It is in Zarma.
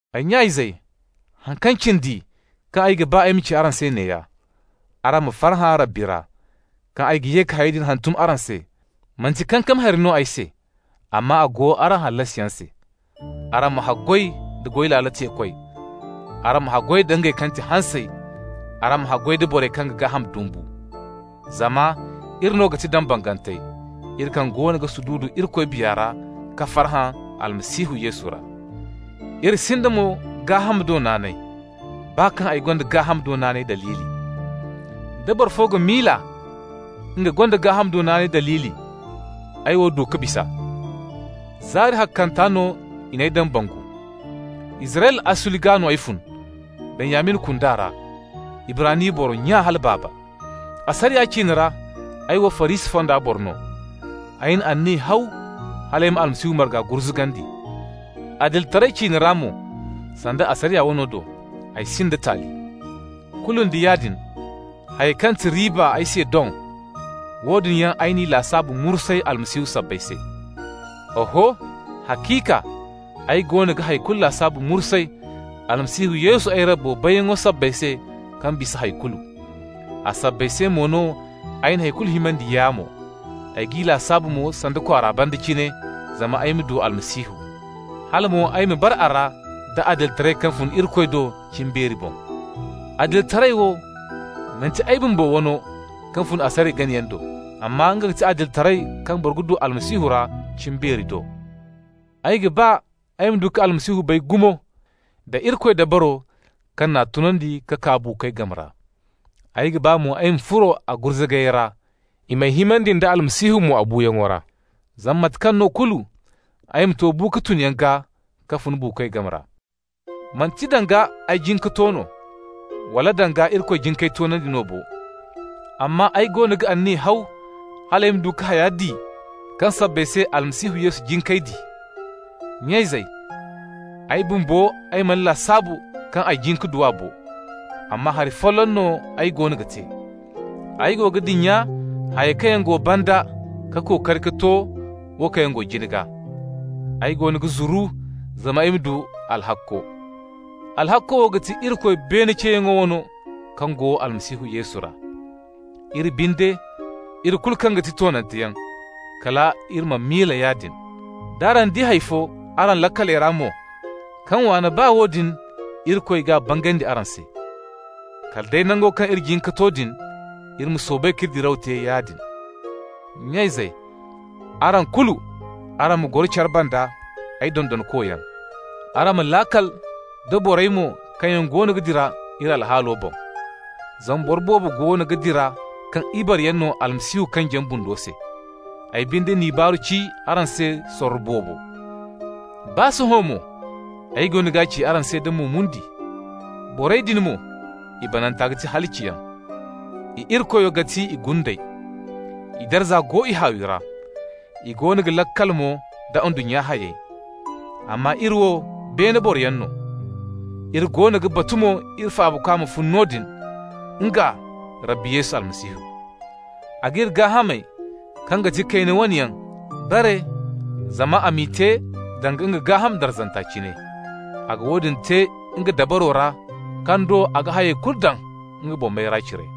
Ay nya-izey, haŋ kaŋ cindi kaŋ ay ga ba ay ma ci araŋ se neeya: araŋ ma farhã Rabbi ra. Kaŋ ay ga ye ka hayey din hantum araŋ se, manti kankami hari no ay se, amma a go araŋ hallasiyaŋ se. Araŋ ma haggoy da goy laalo teekoy, araŋ ma haggoy da ngey kaŋ ga ti hansey, araŋ ma haggoy da borey kaŋ ga gaaham dumbu. Zama iri no ga ti dambangantey, iri kaŋ goono ga sududu Irikoy Biya ra ka farhã Almasihu Yesu ra. Iri sinda mo gaaham do naanay, baa kaŋ ay gonda gaaham do naanay daliili. Da boro fo ga miila nga gonda gaaham do naanay daliili, ay wo du ka bis'a. Zaari ahakkanta no i n'ay dambangu, Israyla asuli gaa no ay fun, Benyamin kunda ra, Ibrani boro nya hala baaba. Asariya ciine ra, ay wo Farisi fonda boro no. Ay na anniya haw hal ay na Almasihu marga gurzugandi. Adilitaray ciine ra mo (sanda asariya wano do), ay sinda taali. Kulu nda yaadin, hayey kaŋ ga ti riiba ay se doŋ, woodin yaŋ ay n'i lasaabu mursay Almasihu sabbay se. Oho, haciika ay goono ga hay kulu lasaabu mursay Almasihu Yesu ay Rabbo bayyaŋo sabbay se kaŋ bisa hay kulu. A sabbay se mo no ay na hay kulu himandi yaamo. Ay g'i lasaabu mo sanda kwaara banda cine zama ay ma du Almasihu, hala mo ay ma bara a ra da adilitaray kaŋ fun Irikoy do cimbeero boŋ. Adilitaray wo, manti ay bumbo wano kaŋ fun asariya ganayaŋ do. Amma nga ga ti adilitaray kaŋ boro ga du Almasihu ra cimbeeri do. Ay ga ba ay ma du ka Almasihu bay gumo, da Irikoy dabaro kaŋ n'a tunandi ka kaa buukoy game ra. Ay ga ba mo ay ma furo a gurzugayey ra, i m'ay himandi nda Almasihu a buuyaŋo ra. Zama mate kaŋ no kulu ay ma to bu-ka-tun gaa ka fun buukoy game ra. Manti danga ay jin ka to no, wala danga Irikoy jin k'ay toonandi no bo, amma ay goono ga anniya haw hal ay ma du ka haya di kaŋ sabbay se Almasihu Yesu jin k'ay di. Nya-izey, ay bumbo, ay mana lasaabu kaŋ ay jin ka du a bo, amma hari folloŋ no ay goono ga te: ay go ga dinya hayey kaŋ yaŋ go banda ka kookari ka to wo kaŋ yaŋ go jina gaa. Ay goono ga zuru zama ay ma du alhakko. Alhakko wo ga ti Irikoy beene ceeyaŋ wano, kaŋ go Almasihu Yesu ra. Iri binde, iri kulu kaŋ ga ti toonanteyaŋ, kala iri ma miila yaadin. D'araŋ di hay fo araŋ laakaley ra mo kaŋ waan'a, baa woodin Irikoy g'a bangandi araŋ se. Kala day nango kaŋ iri jin ka to din, iri ma soobay k'iri diraw te yaadin. Nya-izey, araŋ kulu, araŋ ma goro care banda ay dondonkoyaŋ. Araŋ ma laakal da borey mo kaŋ yaŋ goono ga dira iri alhaalo boŋ. Zama boro boobo goono ga dira kaŋ ibareyaŋ no Almasihu kanjiyaŋ bundo se. Ay binde n'i baaru ci araŋ se sorro boobo. Baa sohõ mo ay goono g'a ci araŋ se da mo-mundi. Borey din mo, i bananta ga ti halaciyaŋ. I irikoyo ga ti i gundey. I darza go i haawi ra. I goono ga laakal mo da ndunnya hayey. Amma iri wo beene boroyaŋ no. Iri goono ga batu mo iri Faabakwa ma fun noodin, nga Rabbi Yesu Almasihu. A g'iri gaahamey kaŋ ga ti kayna wane yaŋ bare zama a m'i te danga nga gaaham darzanta cine. A ga woodin te nga dabaro ra kaŋ do a ga hayey kulu daŋ nga boŋ mayra cire.